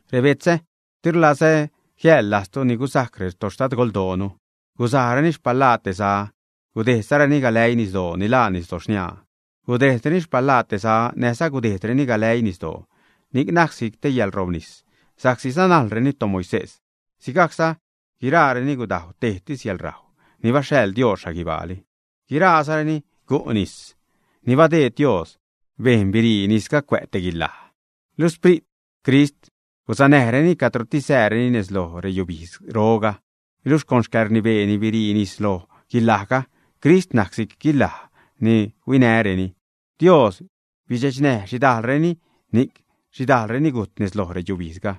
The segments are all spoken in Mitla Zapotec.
Rebetzä, di rlazä jiäḻlajztu ni gusajc retoxtadgoldoonu. Gusajreni xpalaa te za gudejdzareni galäii nisdoo ni laa Nisdo Xniaa. Gudejdreni xpalaa te za näjza gudejdreni galäii nisdoo; ni'c najc si'c te yäḻrobnis sa'csi sanajlreni toMoisés. Sigajcza guiraareni gudajw tejtis yäḻrajw ni baxhaḻ Dios xhaguibaali. Guiraazareni gu' nis ni badeed Dios, Dios bejn birii nisga cuä' te guilaj. Luxh Xprit Crist gusanäjreni cadrotis sääreni nez lo reyubidzroga. Luxh con xcäḻrnibeeni birii nis loj guilajga, Crist najc si'c guilaj ni huinäreni. Dios bidxechnäj xhidajlreni, ni'c xhidajlreni gujt nez lo reyubijdzga.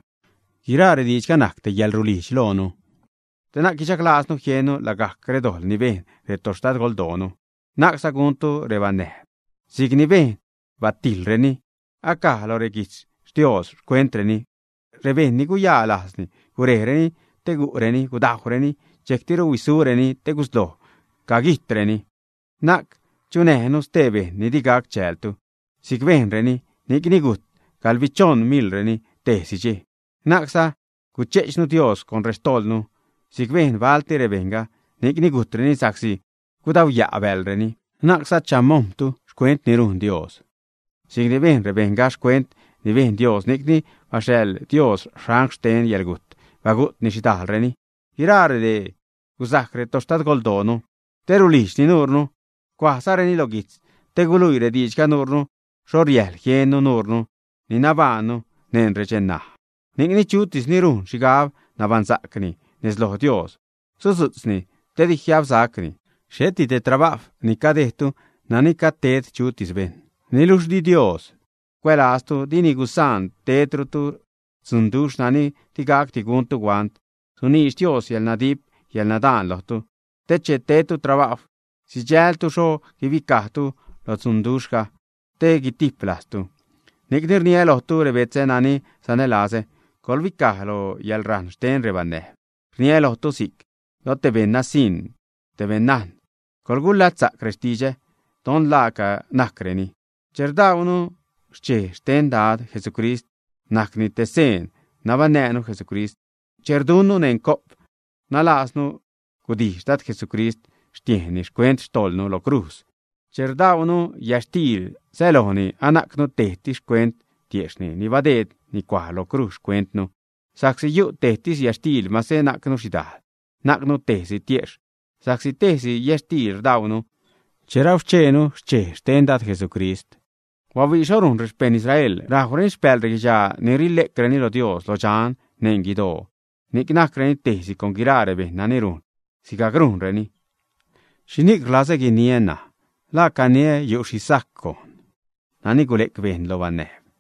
Guiraa rediidxga najc te yäḻrulijdx loonu, te na'c guichaglajznu jiennu lagajc redojḻ ni bejn retoxtadgoldoonu. Na'cza gaṉtu rebanäjb si'c ni bejn baltireni; acaj lo rexquijtz Dios xcuentreni: “Rebejṉ ni guyaa lajz gurejreni te gu'reni, gudajwreni, dxejctiru huisureni te gusloj caguijtreni.” Na'c chunäjnu stee bejṉ di gac chäältu si'c bejnreni, ni'cni gujt gaḻbichoṉ miḻreni tejtis dxej. Na'cza guche'chnu Dios con rextojḻnu si'c bejn balti rebejṉga, ni'cni gujtreni sa'csi gudauya' bäḻreni. Na'cza chamojm̲tu xcuent ni rujn Dios si'c ni bejn rebejṉga xcuent ni bejn Dios, ni'cni baxhaḻ Dios angl xten yäḻgujt bagu't xhidajlreni. Guiraa redee gusajc retoxtadgoldoonu te rulijdxni nuurnu, cuajzareni lo guijtz te guluii rediidxga nuurnu xho riäjl jiennu, nuurnu ni nabajṉnu neṉ redxej ṉaj. Ni'cni chutis ni rujn xhigab nabaṉsa'cni nez loj Dios, sudzu'tzni te di jiabsacni. Xheti te trabajw ni cadejdtu nani gajd ted chutis bejṉ. Niluxh di Dios cuälaztu, dini gusaan tedrutu dzunduxh nani digacdi guntu huant, suniidx Dios yäḻnadip yäḻnadaan lojtu te che tedtu trabajw sidxältu xho guibicajtu lo dzunduxhga, te gutiplajztu. Ni'cni rniä lojtu, rebetzä nani sanälazä, coḻbicaj lo yäḻrajṉ xten rebanäjb. Rniä lojtu si'c lo te beṉ nasiṉ, te beṉnajn: coḻgulatzsa'c rextidxä don la laaca najcreni. Che rdaunu xchej xten Dad Jesucrist najcni te seen nabaṉnäänu Jesucrist. Che rdunnu neṉ co'p, rnaalajznu gudijx Dad Jesucrist xtiejnni xcuent xtojḻnu lo crujz. Che rdaunu yätxtiil, sälojni anajcnu tejtis xcuent tiejxhni ni badeedni cuaj lo crujz xcuentnu. Sa'csi yu' tejtis yätxtiil, mase najcnu xhidajl, najcnu si'c tejsi tiejxh sa'csi tejsi yätxtiil rdaunu che rauxchejnu xchej xten Dad Jesucrist. ¡Bahuii xho rujn rexpejṉ Israel! Rajwreni xpääl reguidxaa ni rile'creni lo Dios lo dxan neṉ guidoo, ni'c najcreni tejsi con guiraa rebejṉ nani rujn sigajc rujnreni. ¿Xhixhni'c rlazä guiniä, ṉaj? ¿La caniä yu' xhi sajc gojn nani gule'c bejṉ lo banäjb, ä?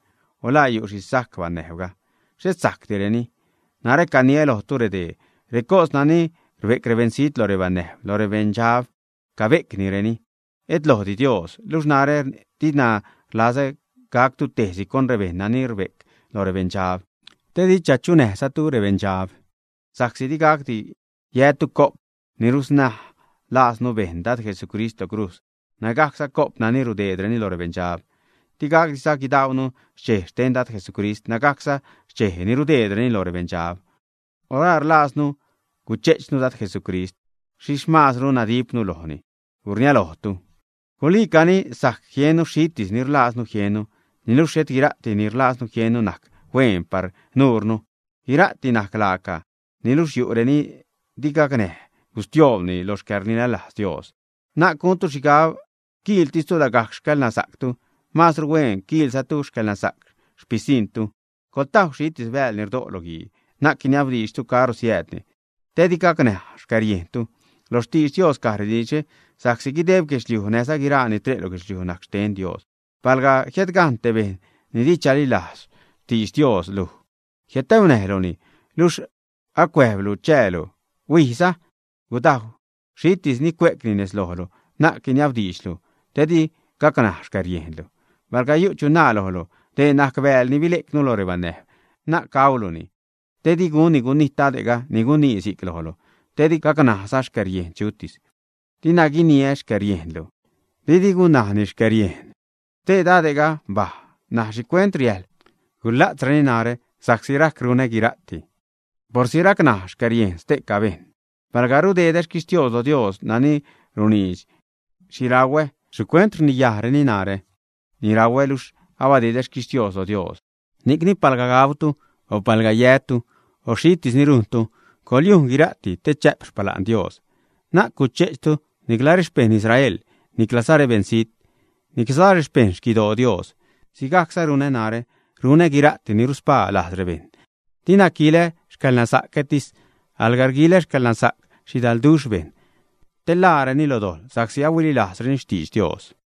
O ¿la yu' xhi sajc banäjbga, ä? Xhet sajcdireni. Narä caniä lojtu dee: Recos nani rbe'c rebeṉzijt lo rebanäjb, lo rebeṉdxab cabe'crenini, et lojdi Dios. Luxh narä dina rlazä gactu tejsi con rebejṉ nani rbe'c lo rebeṉdxab, te di chachunäjzatu rebeṉdxab. Sa'csi digacdi yätu co'p ni rusnaj laaznu ni bejn Dad Jesucrist lo crujz nägajcza co'p nani rudeedreni lo rebeṉdxab. Digacdiza guidaunu xchej xten Dad Jesucrist nägajcza xchej ni rudeedreni lo rebeṉdxab. O ¿la rlajznu guche'chnu Dad Jesucrist, ä? ¿Xhixh maazru nadipnu lojni, ä? ¡Gurniä lojtu! Guliicani, sajc jiennu xhitis ni rlajznu jiennu, niluxh xhet guira'ti ni rlajznu jiennu najc hueen par nuurnu. Guira'ti najc laaca, niluxh yu' reni di gacnäj gustioobnu lo xcäḻrililajz Dios. Na'c guntu xhigab quiiltistu lagajc xcäḻnasa'ctu; maazru hueen quiilzatu xcäḻnasa'c xpisiṉtu. Coḻtajw xhitis bääl ni rdo' lo guii, na'c guiniabdiidxtu caro siäädni te di gacnaj xcäriejntu. Lo xtidx Dios caj rediidxre: “Sa'csi guideb guedxliuj näjza guiraa ni tre' lo guedxliuj najc xten Dios.” Palga jiädgajṉ te bejṉ ni di chalilajz xtidx Dios luj jiädtaunäjluni luxh acuäjblu chäälu, huijza, gudajw xhitis ni cue'cni nez lojlu, na'c guiniabdiidxlu te di gacnaj xcäriejnlu. Palga yu' chu naa lojlu: “Dee najc bääl ni bile'cnu lo rebanäjb”, na'c gauluni, didi gunni gunijt dade'ga ni gunii si'c lojlu te di gacnajza xcäriejn chutis. Dina guiniä xcäriejnlu, didi gunnajni xcäriejn stee dade'ga; mbaj ṉaj, ¿xhicuent riäjḻ gula'tzreni narä sa'csi rajc runä guira'ti porsi racnaj xcäriejn ste'ca bejṉ, ä? Palga rudedä xquixtios lo Dios nani runiidx xhi rauä, ¿xhicuent rniyajreni narä ni rauä, luxh abadedä xquixtios lo Dios? Ni'cni palga gautu, o palga yätu o xhitis ni rujntu, coḻyujn guira'ti te chä'p xpala'n Dios. Na'c guche'chtu nicla rexpejṉ Israel niclaza rebeṉzijt, niclaza rexpejṉ xquidoo Dios. Sigajcza runä narä, runä guira'ti ni ruspaa lajz rebejṉ, dina quilä xcäḻnasa'cätis, alga rguilä xcäḻnasa'c xhidalduxh bejṉ, te ḻaareni lo dojḻ sa'csi ahuililajzreni xtidx Dios.